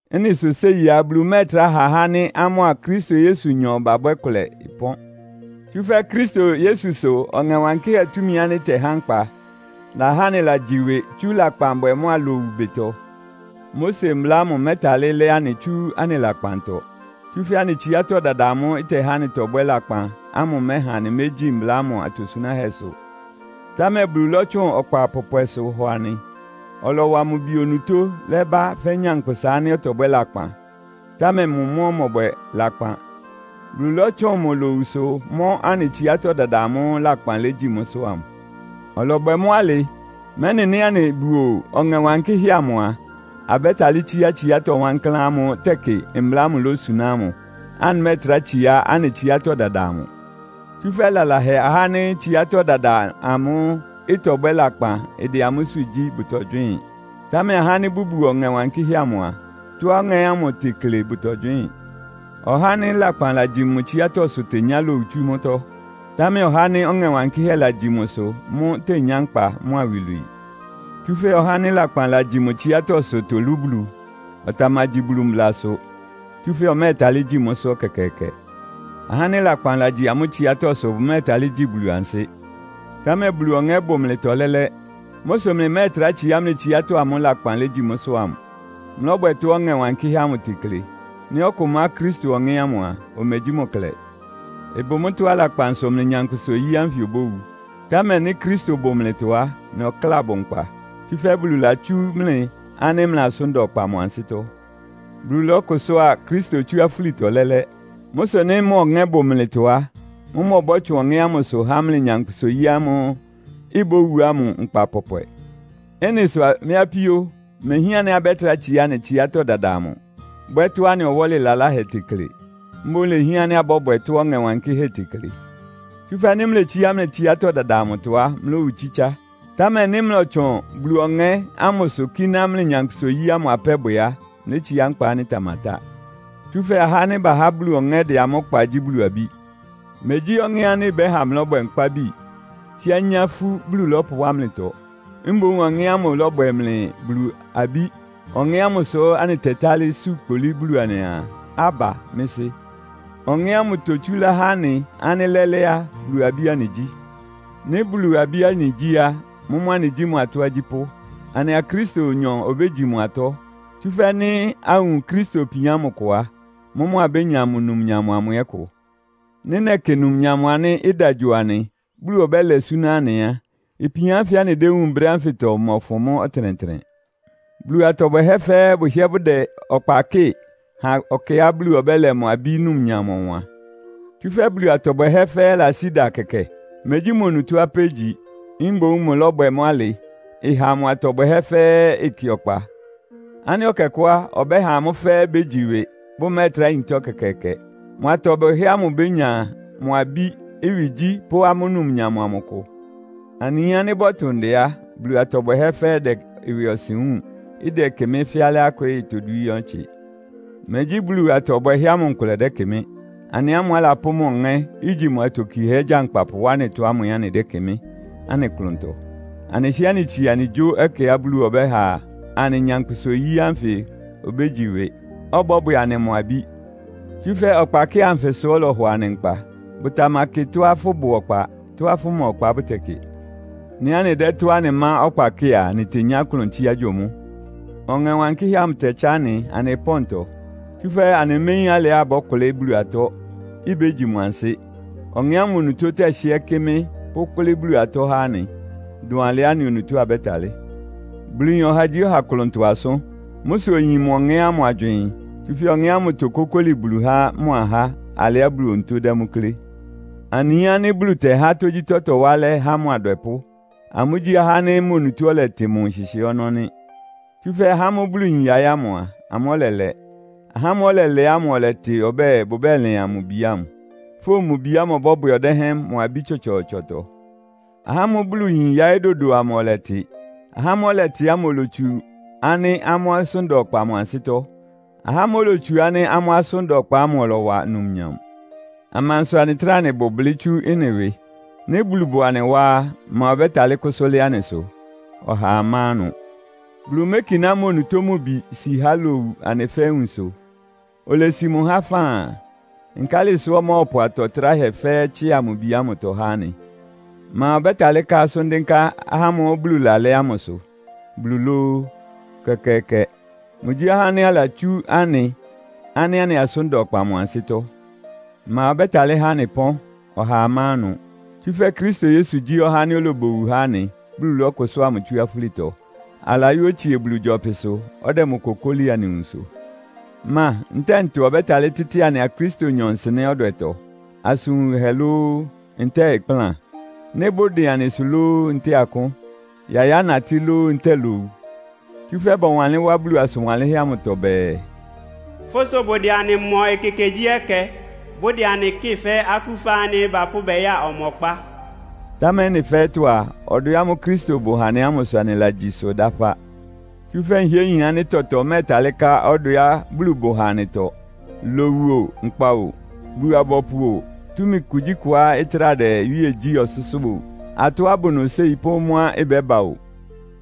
Ɩ́nɩ sʋ séi á, Bulu mɛ́ɛtrá ha ahá ánɩ́ amʋ́a Kristo Yesunyɔ babwɛ́ kʋlɛ ɩpɔ́n. Tsúfɛ́ Kristo Yesu sʋ Ɔŋɛ Wankɩ́hɛ́ túmi ánɩ́ ɩtɛhá nkpa lahá anɩlagyi ɩwɩ tsú lakpanbwɛ mʋ́a lowu ɩbɩtɔ. Mose Mbla ámʋ mɛ́talɩ́ lɛ́ anɩ tsú anɩ lakpantɔ. Tsúfɛ́ anɩ tsiátɔ́ dada amʋ́ʋ́ ɩtɛhá anɩtɔbwɛ́ lakpan ámʋ ɩmɛha anɩmégyí mbla ámʋ atosunáhɛ́sʋ. Támɛ Bulu lɔ́tsʋn ɔkpa pɔpwɛsʋ hɔ anɩ. Ɔlɔwa mʋ Bi onutó lɛ́bá fɛ́ nyankpʋsa ánɩ́ ɔtɔbwɛ́ lakpan, támɛ mʋ mʋ́ ɔmɔbwɛ lakpan. Bulu lɔ́tsʋn mʋ lowusʋ mɔ́ anɩ tsiátɔ́ dada amʋ́ʋ́ lakpan legyi mʋ́sʋ́ ámʋ. Ɔlɔbwɛ mʋ́ alɩ, mɛ́nɩ nɩ́ anɩbuo Ɔŋɛ Wankɩ́hɛ́ amʋ a, abɛ́talɩ́ tsíá tsiátɔ́ wankláán ámʋ́ʋ́ tɛkɩ mbla ámʋ lósuná ámʋ, anɩmɛ́ɛtrá tsiá anɩ tsiátɔ́ dada amʋ. Tsúfɛ́ lalahɛ ahá ánɩ́ tsiátɔ́ dada ámʋ́ʋ́ ɩtɔbwɛ́ lakpan ɩdɛ amʋ́sʋ́ gyí bʋtɔgywɩ́ɩn. Támɛ ahá ánɩ́ bʋbuo Ɔŋɛ Wankɩ́hɛ́ amʋ a, tɔ́á Ɔŋɛ́ ámʋ tekle bʋtɔgywɩ́ɩn. Ɔhá ánɩ́ lakpan lagyi mʋ tsiátɔ́sʋ tenyá lowu tsú mʋ́tɔ́. Támɛ ɔhá ánɩ́ Ɔŋɛ Wankɩ́hɛ́ lagyi mʋsʋ mʋ́ tenyá nkpa mʋ́a iwilwii. Tsúfɛ́ ɔha ánɩ́ lakpan lagyi mʋ tsiátɔ́sʋ tolú Bulu. Ɔtamagyi Bulu mblasʋ, tsúfɛ́ ɔmɛ́ɛtalɩ́ gyi mʋ́sʋ́ ɛkɛkɛɛkɛ. Ahá ánɩ́ lakpan lagyi amʋ́ tsiátɔ́sʋ bʋmɛ́ɛtalɩ́ gyi Bulu ansɩ́. Támɛ Bulu Ɔŋɛ́ bʋ mlɩtɔ lɛ́lɛ́. Mʋ́ sʋ mlɩmɛ́ɛtrá tsiá mlɩ tsiátɔ́ amʋ́ʋ́ lakpan legyi mʋ́sʋ́ ámʋ. Mlɔ́bwɛ tɔ́á Ɔŋɛ Wankɩ́hɛ́ amʋ tekle. Nɩ́ ɔkʋ má Kristo Ɔŋɛ́ ámʋ a, omegyí mʋ klɛ. Ɩbʋ mʋ́tɔ́á lakpan sʋ mlɩ nyankpʋsa-oyí ánfɩ obówu. Támɛ nɩ́ Kristo bʋ mlɩtɔ á, mlɩ ɔkláa bʋ nkpa. Tsúfɛ́ Bulu latsú mlɩ ánɩ́ mlɩ asʋ́n da ɔkpa mʋ ansɩ́tɔ́. Bulu lɔ́kʋsʋ́a Kristo tsú afúlitɔ lɛ́lɛ́. Mʋ́ sʋ nɩ́ mʋ Ɔŋɛ́ bʋ mlɩtɔ á, mʋ́mʋ́ ɔbɔ́tsʋn Ɔŋɛ́ ámʋsʋ há mlɩ nyankpʋsa-oyí ámʋ́ʋ́ ibówu ámʋ nkpa pɔpwɛ. Ɩ́nɩ sʋ mɩ́ apíó, imehián ánɩ́ abɛ́trá tsiá anɩ tsiátɔ́ dada amʋ, bwɛ́ tɔ́á anɩ ɔwɔ́lɩ laláhɛ tekle. Mboún lehián ánɩ́ abɔ́bwɛ tɔ́á Ɔŋɛ Wankɩ́hɛ́ tekle. Tsúfɛ́ nɩ́ mletsíá mlɩ tsiátɔ́ dada amʋtɔ á, mlówu tsítsá. Támɛ nɩ́ mlɔtsʋn Bulu Ɔŋɛ́ ámʋsʋ kíná mlɩ nyankpʋsa-oyí ámʋ apɛ́ bwɛ á, mlétsiá nkpa ánɩ́ ɩtamatá. Tsúfɛ́ ahá ánɩ́ bahá Bulu Ɔŋɛ́ dɛ amʋ́ kpa gyí Bulu abí. Megyí Ɔŋɛ́ ánɩ́ ɩbɛ́ha mlɔ́bwɛ nkpábi, tsíá nyá ifú Bulu lɔ́pʋwá mlɩtɔ. Mboún Ɔŋɛ́ ámʋ lɔ́bwɛ mlɩ Bulu abí. Ɔŋɛ́ ámʋ sʋ anɩtɛtálɩ́ su kpolí Bulu anɩaa, “Abba, mɩ́ Sɩ́!” Ɔŋɛ́ ámʋ totsúlá há anɩ ánɩ́ lɛ́lɛ́ á, Bulu abí anɩgyí. Nɩ́ Bulu abí anɩgyí á, mʋ́mʋ́ anɩgyí mʋ atɔ́ agyípʋ́. Anɩa Kristonyɔ obégyi mʋ atɔ́. Tsúfɛ́ nɩ́ awun Kristo ipian ámʋ kʋ á, mʋ́mʋ́ abénya mʋ numnyam amʋ ɛ́ kʋ. Nɩ́ nɛkɩ numnyam ánɩ́ ɩda gyo anɩ, Bulu ɔbɛ́lɛ súná anɩ á, ipian ánfɩ anɩdéwúun brɛ́ ánfɩtɔ ɩmɔfʋn mʋ́ ɔtɩnɛtɩnɛ. Bulu atɔ bwɛhɛ́ fɛ́ɛ́ bʋhɩ́ɛ́ bʋdɛ ɔkpa kɩ́ɩ ha ɛkɛá Bulu ɔbɛ́lɛ mʋ abí numnyam ɔwan. Tsúfɛ́ Bulu atɔ bwɛhɛ́ fɛ́ɛ́ lasí ɩda kɛkɛ. Megyí mʋ́ onutó apɛ́ igyi. Mboún mʋlɔ́bwɛ mʋ́ alɩ, ɩha mʋ atɔ bwɛhɛ́ fɛ́ɛ́ ɩkɩ ɔkpa ánɩ́ ɛkɛkʋ́ á, ɔbɛ́ha amʋ́ fɛ́ɛ́ bégyi ɩwɩ, bʋmɛ́ɛtrá yintá ɛkɛkɛɛkɛ. Mʋ atɔ bwɛhɛ́ ámʋ ibénya mʋ abí ɩwɩgyí pʋ́ amʋ́ numnyam amʋ kʋ. Anɩyin ánɩ́ bɔtʋ ndɛ á, Bulu atɔ bwɛhɛ́ fɛ́ɛ́ ɩdɛ ɩwɩɔsɩn wúun. Ɩdɛkɩmɩ́ fɛ́ alɩá ɩkwɩ́ɩ todwíín ɔtsɩ. Megyí Bulu atɔ bwɛhɛ́ ámʋ nkʋlɛ dɛ́kɩmɩ́. Anɩ ámʋ́ʋ́ alapʋ́ mʋ Ɔŋɛ́, igyi mʋ atokiehɛ́ gyankpapʋ wá anɩtɔ ámʋ ɛ́ anɩdɛ́kɩmɩ́ anɩ klʋntɔ. Anɩhɩ́ɛ́ anɩtsie anɩgyó ɛkɛá Bulu ɔbɛ́ha anɩ nyankpʋsa-oyí ánfɩ obégyi ɩwɩ, ɔbɔ́bwɛ anɩ mʋ abí. Tsúfɛ́ ɔkpakɩ́ɩ anfɩ sʋ ɔlɔhɔ anɩ nkpa. Bʋtamakɩ tɔ́á fʋ́bʋ ɔkpa, tɔ́á fʋma ɔkpa bʋtɛkɩ. Nɩ́ anɩdɛ́ tɔ́á anɩmá ɔkpa kɩ́ɩ a, anɩtenyá klʋn tsíá gyo mʋ́. Ɔŋɛ Wankɩ́hɛ́ amʋ tɛtsá anɩ anɩ pɔ́ntɔ. Tsúfɛ́ anɩméyín alɩá abɔ́kʋlɩ́ Bulu atɔ́, ibégyi mʋ ansɩ́. Ɔŋɛ́ ámʋ onutó tɛhɩ́ɛ́ kɩ́mɩ́ pʋ́kʋ́lɩ́ Bulu atɔ́ há anɩ, dʋn alɩá anɩ onutó abɛ́talɩ́. Bulu yin ɔhagyíɔha klʋntɔ asʋ́n. Mʋ́ sʋ oyin mʋ Ɔŋɛ́ ámʋ agywɩɩn. Tsúfɛ́ Ɔŋɛ́ ámʋ tokókóli Bulu há mʋ ahá alɩá Bulu onutó dɛ́ mʋ́ klé. Anɩyin ánɩ́ Bulu tɛhá tógyítɔ́ tɔwá alɛ́ há mʋ adwɛpʋ́. Amʋ́gyí ahá ánɩ́ mʋ onutó ɔlɛtɩ mʋ nhɩhɩɛ́ ɔnɔ́ nɩ́. Tsúfɛ́ ahá ámʋ́ʋ́ Bulu yin yaɩ́ ámʋ a, amʋ́ ɔlɛlɛ. Ahá ámʋ́ʋ́ ɔlɛlɛ ámʋ ɔlɛtɩ ɔbɛ́ɛ, bʋbɛ́lɩan mʋ Bi ámʋ. Fówun mʋ Bi ámʋ ɔbɔ́bwɛ ɔdɛ́hɛn mʋ abí tsɔtsɔɔtsɔtɔ. Ahá ámʋ́ʋ́ Bulu yin yaɩ́ dodo amʋ ɔlɛtɩ. Ahá ámʋ́ʋ́ ɔlɛtɩ ámʋ olotsu ánɩ́ amʋ́ asʋ́n da ɔkpa mʋ ansɩ́tɔ́. Ahá ámʋ́ʋ́ olotsu ánɩ́ amʋ́ asʋ́n da ɔkpa ámʋ ɔlɔwa numnyam. Amansʋ anɩtráa anɩbʋ blɩ́ tsú ɩ́nɩ ɩwɩ? Nɩ́ Bulu bʋ anɩ wá á, ma ɔbɛ́talɩ́ kʋ́sʋ́ lɩ́ɩ́ anɩsʋ? Ɔhaa má ɩnʋ! Bulu mékiná mʋ onutó mʋ Bi ámʋ si há lowu anɩ fɛ́ɛ́ nwunsʋ. Olesi mʋ há faan. Nkálɩ sʋ́ ɔmɔ́ɔpʋ atɔ́ tráhɛ fɛ́ɛ́ tsɩ́a mʋ Bi ámʋtɔ há anɩ? Ma ɔbɛ́talɩ́ ká asʋ́n dɩ́nká ahá ámʋ́ʋ́ Bulu lalɛ́ ámʋsʋ? Bulu lóó? Ɛkɛkɛɛkɛ! Mʋgyí ɔhá ánɩ́ alatsú anɩ ánɩ́ anɩ asʋ́n da ɔkpa mʋ ansɩ́tɔ́. Ma ɔbɛ́talɩ́ há anɩ ɩpɔ́n? Ɔhaa má ɩnʋ! Tsúfɛ́ Kristo Yesu gyí ɔhá ánɩ́ olobowu há anɩ, Bulu lɔ́kʋsʋ́a mʋ tsú afúlitɔ. Alayɔ́ otsie Bulu gyɔpɩsʋ, ɔdɛ mʋ kokóli anɩ nwunsʋ. Ma ntɛ́ɛ ntɔ ɔbɛ́talɩ́ tɩ́tɩ anɩa Kristonyɔ nsɩnɛ́ ɔdwɛtɔ? Asʋn wunhɛ lóó, ntɛ́ɛ ɩkplán? Nɩ́ bʋdɩn anɩsʋ lóó, ntɛ́ɛ akʋ́n? Yayá natɩ́ lóó, ntɛ́ɛ lowu? Tsúfɛ́ bɔwanlɩ́n wá Bulu asʋn wanlɩ́nhɛ́ amʋtɔ bɛɛ, “Fʋ́ sʋ bʋdɛ anɩ mɔ ekekegyíɛkɛ. Bʋdɛ anɩ kɩ́ɩ fɛ́ akúfa ánɩ́ bapʋ́ bɛya ɔmɔkpá.” Támɛ ɩ́nɩ fɛ́ɛ́tɔ́ a, ɔdwɛ ámʋ́ʋ́ Kristo bʋ ha anɩ ámʋ sʋ anɩlagyi ɩsʋ dáfá. Tsúfɛ́ nhɩ́ɛ́ nyin ánɩ́ tɔtɔ mɛ́ɛtalɩ́ ká ɔdwɛá Bulu bʋ ha anɩtɔ. Lowu o, nkpa o, Bulu-abɔpʋ o, túmi kugyíkʋá ɩtráa dɛ iwíe gyí ɔsʋ́sʋ́ o, atɔ́á ɩbʋ nʋ séi pʋ́ mʋ́á ɩbɛ́ba o.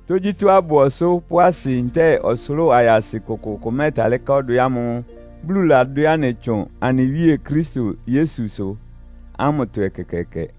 Tógyítɔ́á ɩbʋ ɔsʋ́ pʋ́ asɩ ntɛ́ɛ ɔsʋlʋ́ʋ ayasɩ kʋkʋʋkʋ mɛ́ɛtalɩ́ ká ɔdwɛ ámʋ́ʋ́ Bulu ladwɛ́ anɩ tsʋn anɩ Wíe Kristo Yesusʋ ámʋtɔ ɛkɛkɛɛkɛ.